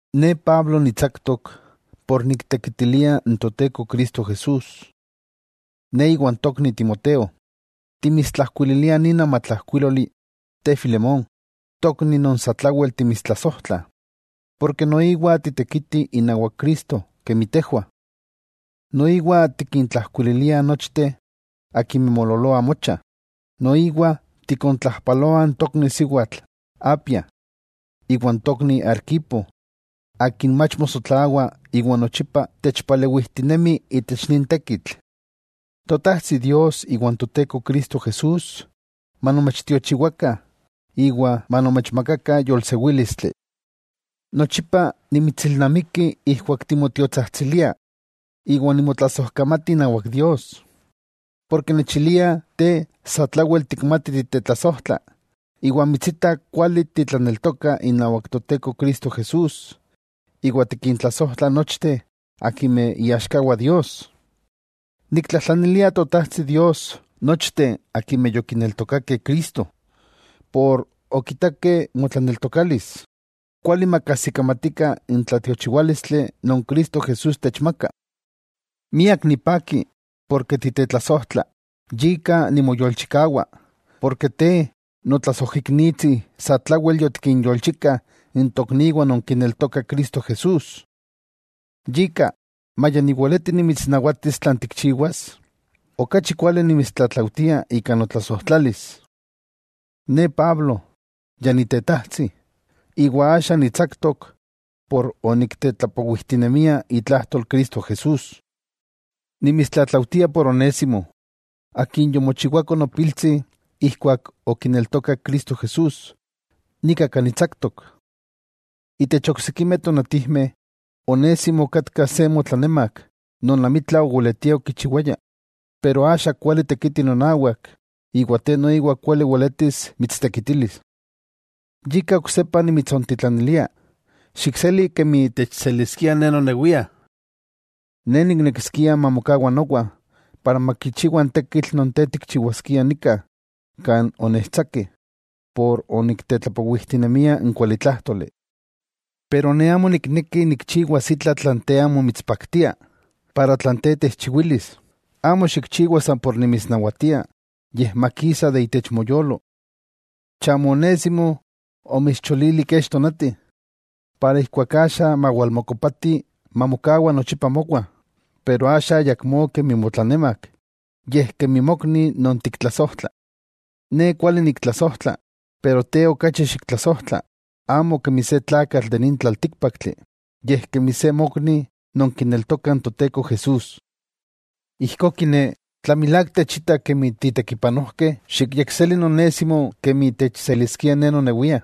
Ne Pablo nitsaktok por niktekitilia n Toteko Cristo Jesús. Ne iwan tokni Timoteo, timitsijkuililiah nin amatlajkuíloli te Filemón, tokni non satlawel timitstlasojtlah, ken noiwa titekiti inawak Cristo kemi tejwah. Noiwa tikintlajkuililiah nochteh akimeh moololoah mocha, noiwa tikontlajpaloah n tokni siwatl Apia, iwan tokni Arquipo akin mach mosotlawa iwa nochipa techpalewijtinemi itech nin tekitl. Totajtsi Dios iwa n Toteko Cristo Jesús, manomechtiochiwakah iwa manomechmaka yolsewílistli. Nochipa nimitsilnamiki ijkuak nimotiotsajtsilia, iwa nimotlasojkamati inawak Dios, ken nechiliah te satlawel tikmati titetlasojtla iwa mitsitah kuali titlaneltoka inawak Toteko Cristo Jesús iwa tikintlasojtla nochteh akimeh iaxkawah Dios. Niktlajtlanilia Totajtsi Dios nochteh akimeh yokineltokakeh Cristo por okitakeh motlaneltokalis, kuali makajsikamatikah n tlatiochiwálistli non Cristo Jesús techmaka. Miak nipaki, ken titetlasojtla yika nimoyolchikawa, porke te notlasojiknitsi satlawel yotikinyolchika n tokniwah non kineltoka Cristo Jesús. Yika, maya niweleti nimitsnawatis tlan tikchiwas, okachi kuali nimitstlatlaujtia ika notlasojtlalis. Ne Pablo, ya nitetajtsi, iwa axa nitsaktok por oniktetlapowijtinemia itlajtol Cristo Jesús. Nimitstlatlaujtia por Onésimo, akin yomochiwako nopiltsi ijkuak okineltokak Cristo Jesús, nika kan nitsaktok. Itech oksikimeh tonatijmeh Onésimo okatka se motlanemak non amitla oweletia okichiwaya, pero axa kuali tekiti nonawak iwa te noiwa kuali weletis mitstekitilis. Yika oksepa nimitsontitlanilia, xikseli kemi techseliskia ne nonewia. Ne niknekiskia mamokawa nowa, para makichiwa n tekitl non te tikchiwaskia nika kan onechtsakeh por oniktetlapowijtinemia n kualitlájtoli. Pero ne amo nikneki nikchiwas itla tlan te amo mitspaktia, ijkó tlan te techchiwilis, amo xikchiwa san por nimitsnawatia yej makisa itech moyolo. Chamo Onésimo omitscholili kech tonati, iwa axa mawalmokopati mamokawa nochipa mowa, pero axa ayakmó kemi motlanemak, yej kemi mokni non tiktlasojtla. Ne kuali niktlasojtla, pero te okachi xiktlasojtla, amo kemi se tlakatl de nin tlaltíkpaktli yej kemi se mokni non kineltoka n Toteko Jesús. Ijkó kiné, tla milák techita kemi titekipanojkeh, xikyekseli n Onésimo kemi techseliskia ne nonewia.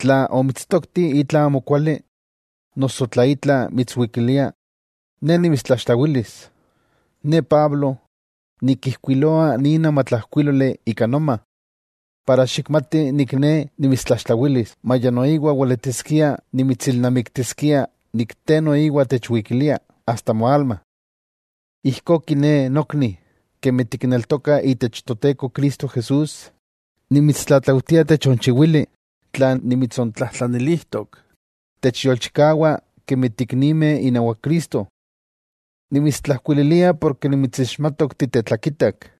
Tla omitstokti itla amokuali, noso tla itla mitswikilia, ne nimitstlaxtlawilis. Ne Pablo, nikijkuiloa nin amatlajkuíloli ika noma, para xikmati ne nimitstlaxtlawilis, maya noiwa weletiskia nimitsilnamiktiskia te noiwa techwikilia, asta moalma. Ijkó kiné nokni, kemi tikneltokah Toteko Cristo Jesús, nimitstlatlaujtia techonchiwili tlan nimitsontlajtlanilijtok, techyolchikawa kemi tiiknimeh inawak Cristo. Nimitstlajkuililia porke nimitsixmatok titetlakitak,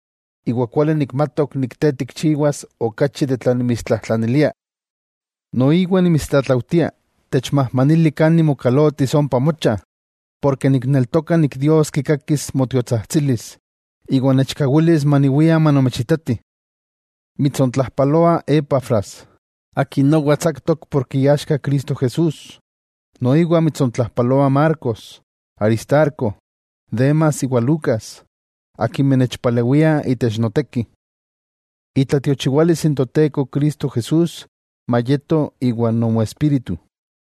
iwa kuali nikmatok te tikchiwas okachi de tlan nimitstlajtlanilia. Noiwa nimitstlatlaujtia techmajmanili kan nimokalotis ompa mocha, porke nikneltoka nik Dios kikakis nomotiotsajtsilis iwa nechkawilis maniwia manomechitati. Mitsontlajpaloa Epafras, akin nowa tsaktok ken iaxka Cristo Jesús. Noiwa mitsontlajpaloa Marcos, Aristarco, Demas iwa Lucas, akimeh nechpalewiah itech noteki. Itlatiochiwalis n Toteko Cristo Jesús mayeto iwan nomoespíritu.